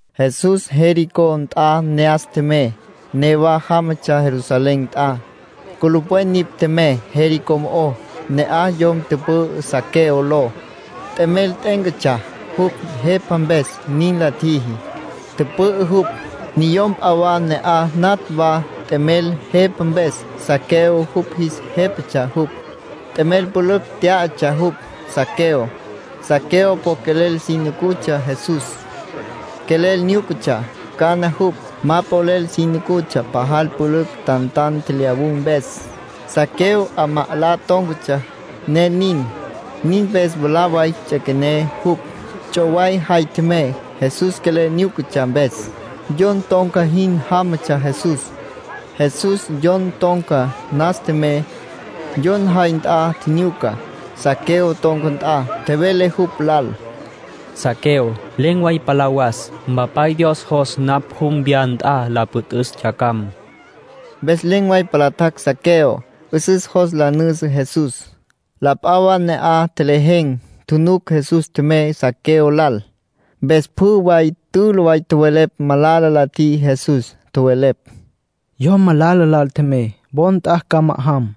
Jesús Jericó nt'a ne'as tjemey. Newa jámatsja Jerusalén nt'a. Culupwen nipj tjemey Jericó mo'ó. Ne'aj yom tüpü'ü Zaqueo ló. T'emel t'e'éncatsja jupj jepa mpes. Nin la tjiji, tüpü'ü jupj. Niyom p'a wa ne'aj natj wa t'emel jepa mpes. Zaqueo yupj jis jépatsja jupj. T'emel pülücj tyá'atsja jupj, Zaqueo. Zaqueo po quelel si nucutsja Jesús. Quelel nyúcatsja cana jupj. Ma polel si nucutsja pajal pülücj tantan tjelyawun̈ mpes. Zaqueo 'amá 'alá tón̈catsja, ne nin. Nin mpes mwalá way ts'üequené jupj, ts'oway jay tjemey, Jesús quelel nyúcatsja mpes. Yon ton̈ca jin jámatsja Jesús. Jesús yon ton̈ca nas tjemey, yon jay nt'a tjinyuca, Zaqueo ton̈ca nt'a. Tjevele jupj lal: —Zaqueo, len̈ way palá was. Mpapay Dios jos napj jum wya nt'a la püt'üs yacjam. Mpes len̈ way palá tjac' Zaqueo. 'Üsüs jos la nüjüsü Jesús. La p'a wa ne'aj tjelejen̈, tjunuc Jesús tjemey Zaqueo lal, mpes pjü way tülü way tjowelepj malala la tjiji Jesús. Tjowelepj: “Yom malala lal tjemey, wo nt'a ca ma'ajam”.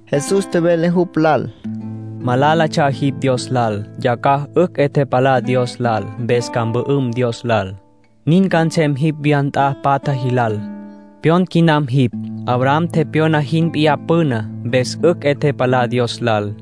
Jesús tjevele jupj lal: —Malálatsja jipj Dios lal. Yacjaj 'ücj 'e tepalá Dios lal, mpes ca mpü'üm Dios lal. Nin ca nsem jipj wya nt'a patja jilal. Pyon quinam jipj, Abraham tepyona jin p'iyá püná, mpes 'ücj 'e tepalá Dios lal.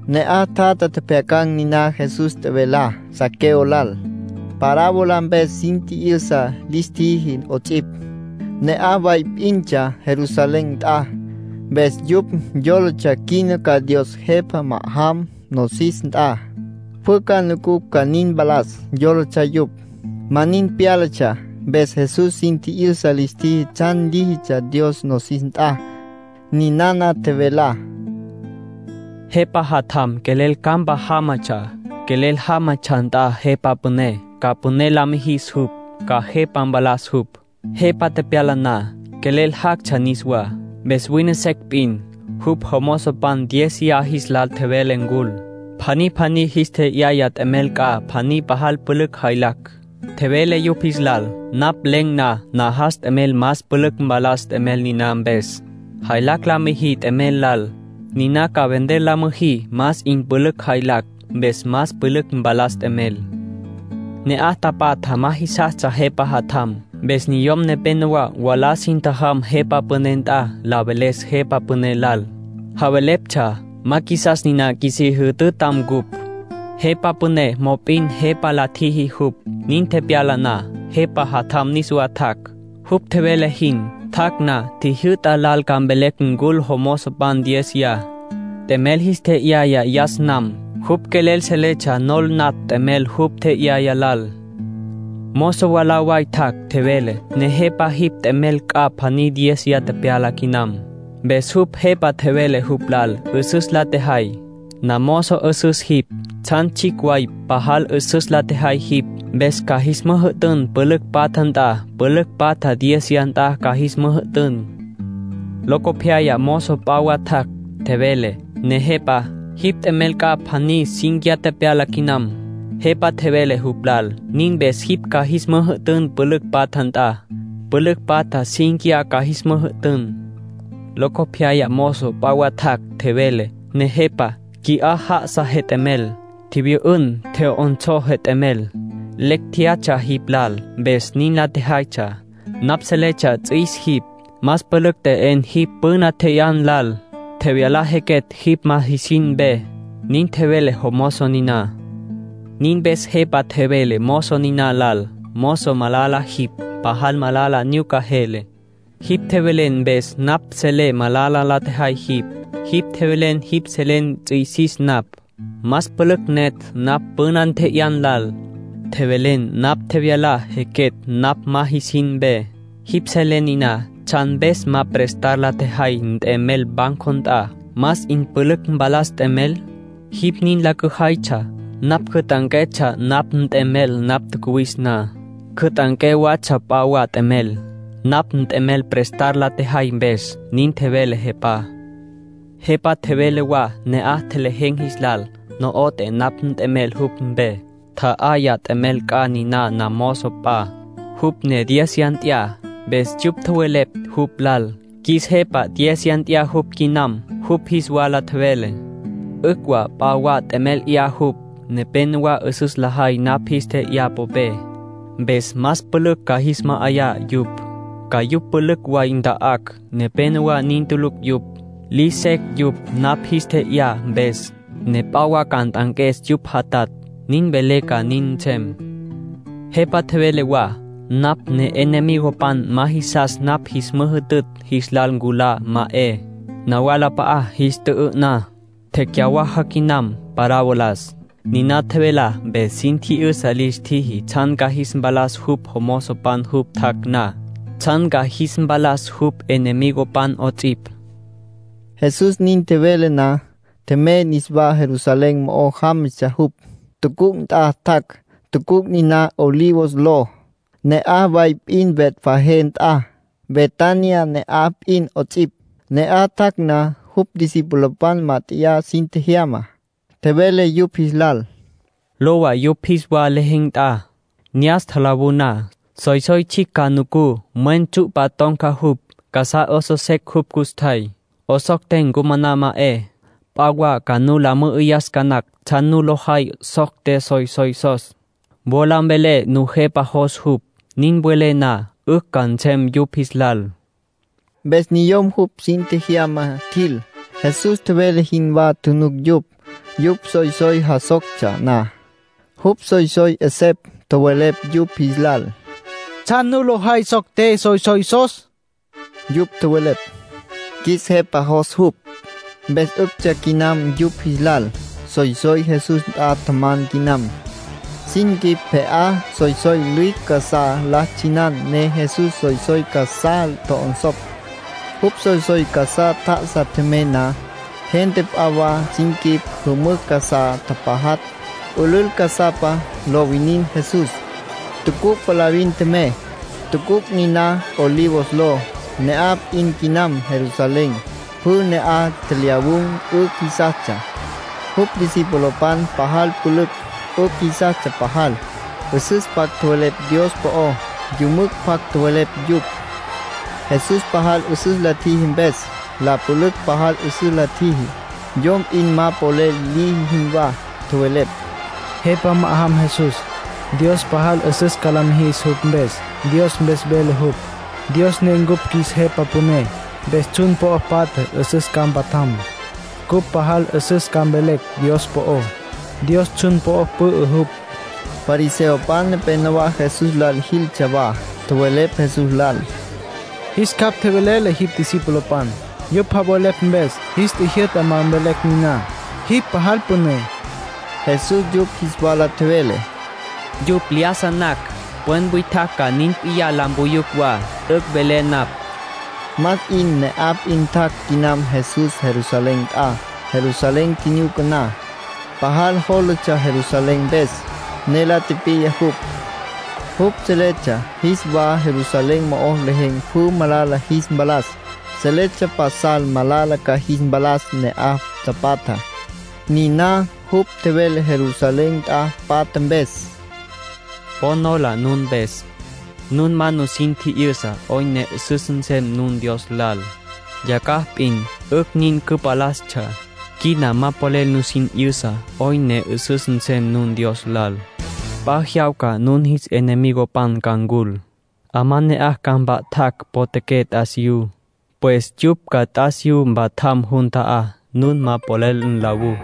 Ne'aj tjatja tjepjyacan̈ niná Jesús tjevelá Zaqueo lal. Parábola mpes sin tji'yüsa lis tjiji 'ots'ipj. Ne'aj way p'intsja Jerusalén nt'a, mpes yupj yólatsja quina ca Dios Jepa ma'ajam nosis nt'a. Pjü ca nucucj ca nin mpalas, yólatsja yupj. Ma nin pyálatsja, mpes Jesús sin tji'yüsa lis tjiji tsjan líjitsja Dios nosis nt'a. Ninana tjevelá: “Jepa jatjam quelel campa jámatsja. Quelel jámatsja nt'a jepa püné ca püné la mijis jupj, ca jepa mpalas jupj. Jepa tepyala na, quelel jactsja niswá. Mpes wine secj p'in, jupj jomozopan diéziya jis lal tjevele ncul. Pjaní pjaní jis tje'yaya t'emel c'a pjaní pajal pülücj jaylacj. Tjevele yupj jis lal: ‘Napj len̈ na, najas t'emel más pülücj mpalas t'emel niná mpes. Jaylacj la müjí t'emel lal. Niná ca vender la müjí más 'in pülücj jaylacj. Mpes más pülücj mpalas t'emel.’ ”Ne'aj tapatjá ma jisastsja jepa jatjam. Mpes niyom nepénowa mwalá sin tjajam jepa püné nt'a, la veles jepa püné lal. Javeleptsja: ‘Ma qjuisas nina qjuisí jütütam ncupj’. Jepa püné mop'in jepa la tjiji jupj. ”Nin tepyala na, jepa jatjam niswa tjac', jupj tjevele jin. Tjac' na, tjijyü'ta lal ca mvelecj ncul jomozopan diéziya, t'emel jis tje'yaya yas nam. Jupj quelel seletsja nol natj t'emel jupj tje'yaya lal. Mozo mwalá way tjac', tjevele: ‘Nejepa, jipj t'emel c'a pjaní diéziya tepyala quinam’. Mpes jupj jepa tjevele jupj lal: ‘'Üsüs la tjejay. Namozo 'üsüs jipj. Tsjan tsjicj way pajal 'üsüs la tjejay jipj, mpes ca jis müjü'tün pülücj patja nt'a, pülücj patja diéziya nt'a ca jis müjü'tün.’ ”Locopyaya mozo p'a wa tjac', tjevele: ‘Nejepa, jipj t'emel c'a pjaní cínquiya tepyala quinam’. Jepa tjevele jupj lal: ‘Nin mpes jipj ca jis müjü'tün pülücj patja nt'a, pülücj patja cínquiya ca jis müjü'tün’. ”Locopyaya mozo p'a wa tjac', tjevele: ‘Nejepa, qui'á já'asa jet'emel. Tjivyü'ün, tje'yonsó jet'emel. Lecj tjeyatsja jipj lal, mpes nin la tjejaytsja. Napj seletsja ts'üis jipj. Más pülücj t'e'en jipj püna tje'yan lal. Tjevyala jequetj jipj ma jisin mpe’, nin tjevele jomozo niná. Nin mpes jepa tjevele mozo niná lal: ‘Mozo malala jipj. Pajal malala nyuca jele. Jipj tjevelen mpes napj selé malala la tjejay jipj. Jipj tjevelen jipj selen ts'üisis napj. Más pülücj netj napj püna tje'yá lal. Tjevelen napj tjevyala jequetj napj ma jisin mpe. Jipj selen niná. ¿Tsjan mpes ma prestar la tjejay nt'emel banco nt'a, más 'in pülücj mpalas nt'emel? Jipj nin la cüjaytsja, napj cüt'anquetsja napj nt'emel napj tjacuwis na. Cüt'anqué watsja p'a wa t'emel, napj nt'emel prestar la tjejay mpes’, nin tjevele jepá. ”Jepa tjevele wa ne'aj tjelejen̈ jis lal: ‘No'oté napj nt'emel jupj mpe. Tja'ayá t'emel c'a niná namozo p'a, jupj ne diéziya tya'a.’ Mpes yupj tjowelepj jupj lal: ‘Qjuis Jepa, diéziya tya'a jupj quinam’. Jupj jis wala tjevele: ‘'Ücj wa p'a wa t'emel 'ya jupj. Nepénowa 'üsüs lajay napj jis tje'yá popé, mpes más pülücj ca jis ma'ayá yupj. Ca yupj pülücj way nta'acj. Nepénowa nin tulucj yupj. Liji secj yupj napj jis tje'yá mpes, ne p'a wa ca nt'anques yupj jatatj. Nin velé ca nin nsem.’ ”Jepa tjevele wa: ‘Napj ne'enemigopan ma jisastsja napj jis müjütütj, jis lal nculá, ma 'e. Nawalap'a'a jis tjü'ü'ná.’” Tecyawaja quinam parabolas. (Niná tjevelá mpes sin tji'yüsa lis tjiji tsjan ca jis mpalas jupj jomozopan jupj tjac' na, tsjan ca jis mpalas jupj enemigopan 'ots'ipj.) Jesús nin tjevele na, tjemey niswá, Jerusalén mo'o jámatsja jupj. Tucuc' nt'a tjac', tucuc' niná Olivos ló, ne'aj way p'in Betfagé nt'a, Betania ne'aj p'in 'ots'ipj. Ne'aj tjac' na, jupj discipulopan mát'eya sin tjejyama, tjevele yupj jis lal: “Lowa yupj jis wa lejen̈ nt'a. Ne'as tjalawú na, soysoy tsjicj ca nucú. Mwen tsyu'pa ton̈ca jupj. Casá 'osos secj jupj custjay. 'Osocté ncumaná, ma 'e. P'a wa ca nu la mü'üyas ca nacj tsjan nu lo jay socté soysoysos. Wola mvelé Nujepa jos jupj. Nin welé na, 'ücj ca nsem yupj jis lal.” Mpes niyom jupj sin tjejyama tjil, Jesús tjevele jinwá tjunuc yupj. Yupj soysoy jasoctsja na, jupj soysoy 'esepj tjowelepj yupj jis lal: —¿Tsjan nu lo jay socté soysoysos? Yupj tjowelepj: —Qjuis Jepa jos jupj. Mpes 'üctsja quinam yupj jis lal. Soysoy Jesús nt'a tjaman quinam. Sin quip pje'apa soysoy lüicj casá la tsjinan ne Jesús soysoy casá tjo'onsopj. Jupj soysoy casá tjá'asa tjemey na, gente p'a wa sin quip jümücj casá tapajatj, pülül casapa lo winin Jesús. Tucuc' palavin tjemey, tucuc' niná Olivos ló, ne'aj p'in quinam Jerusalén. Pjü ne'aj tjelyawun̈ 'ücj jisastsja, jupj discipulopan pajal pülücj, 'ücj jisastsja pajal. 'Üsüs pjac tjowelepj Dios po'ó, yümücj pjac tjowelepj yupj, Jesús pajal 'üsüs la tjiji mpes. La pülücj pajal 'üsüs la tjiji, yom p'in ma polel liji jinwá. Tjowelepj: —Jepa ma'ajam Jesús. Dios pajal 'üsüs ca la mijis jupj mpes. Dios mpes vele jupj, Dios ne cupj qjuis Jepa Püné. Mpes tsjun po'o patja 'üsüs ca mpatjam. Cupj pajal 'üsüs ca mvelecj Dios po'ó. Dios tsjun po'o pü'ü jupj. Fariseopan nepenowá Jesús lal jiltsja wa. Tjowelepj Jesús lal: —Jis capj tjeve'le jipj discipulopan, yupj javelepj mpes. Jis tjijyü'ta ma mvelecj niná, jipj pajal püné. Jesús yupj jis wala tjevele: —Yupj lyájasa nacj, pwen witjacj ca nin p'iyá la mpuyucj wa. T'üc' velé napj. Más 'in ne'aj p'in tjac' quinam Jesús Jerusalén nt'a. Jerusalén tjinyuca na, pajal jólatsja Jerusalén mpes, ne la tipiya jupj. (Jupj seletsja jis wa Jerusalén mo'o lejen̈ pjü malala jis mpalas. Seletsja pasal malala ca jis mpalas ne'aj tapatjá.) Niná jupj tjevele Jerusalén nt'a patja mpes: —Po nola nun mpes, nun ma nusin tji'yüsa 'oyn ne 'üsüs nsem nun Dios lal. Yacjaj p'in 'ücj nin cüpalastsja. Quina ma polel nusin 'yüsa 'oyn ne 'üsüs nsem nun Dios lal. P'a jyawca nun jis enemigopan ca ncul, 'amá ne'aj ca mpa'tacj potjaqué t'asiyú. Pues yupj ca t'asiyú mpatjam jun ta'á, nun ma polel nlawú.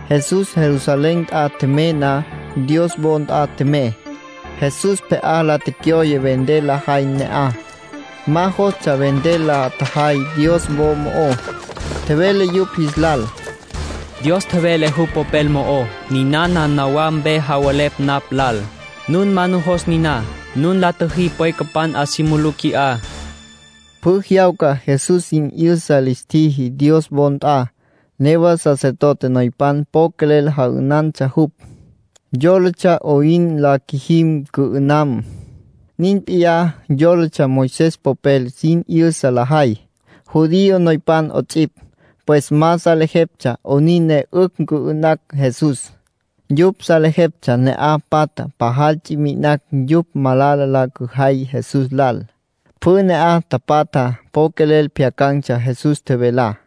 Jesús Jerusalén nt'a tjemey na, Dios wo nt'a tjemey. Jesús pje'á la tecyoye vender lajay ne'aj. Ma jostsja vender la tjajay Dios wo mo'ó. Tjevele yupj jis lal: “Dios tjevele jupj Popel mo'ó: ‘Ninana nawá mpe javelepj napj lal’. Nun ma nujos niná. Nun la tjüjí pwecapan 'a si mulú qui'á”, tjevele Jesús. Pjü jyawca Jesús sin 'yüsa lis tjiji Dios wo nt'a. Newa sacerdote noypan po quelel ja'ünantsja jupj. Yólatsja 'oyn la qjuijim cü'ü'nam. Nin p'iyá yólatsja Moisés popel sin 'yüsa lajay, judío noypan 'ots'ipj. Pues ma salejeptsja 'onin ne 'ücj cü'ü'nacj Jesús. Yupj salejeptsja ne'aj patjá pajal ts'i mi'inacj yupj malala la cüjay Jesús lal. Pjü ne'aj tapatjá po quelel pjyacan̈tsja Jesús tjevelá.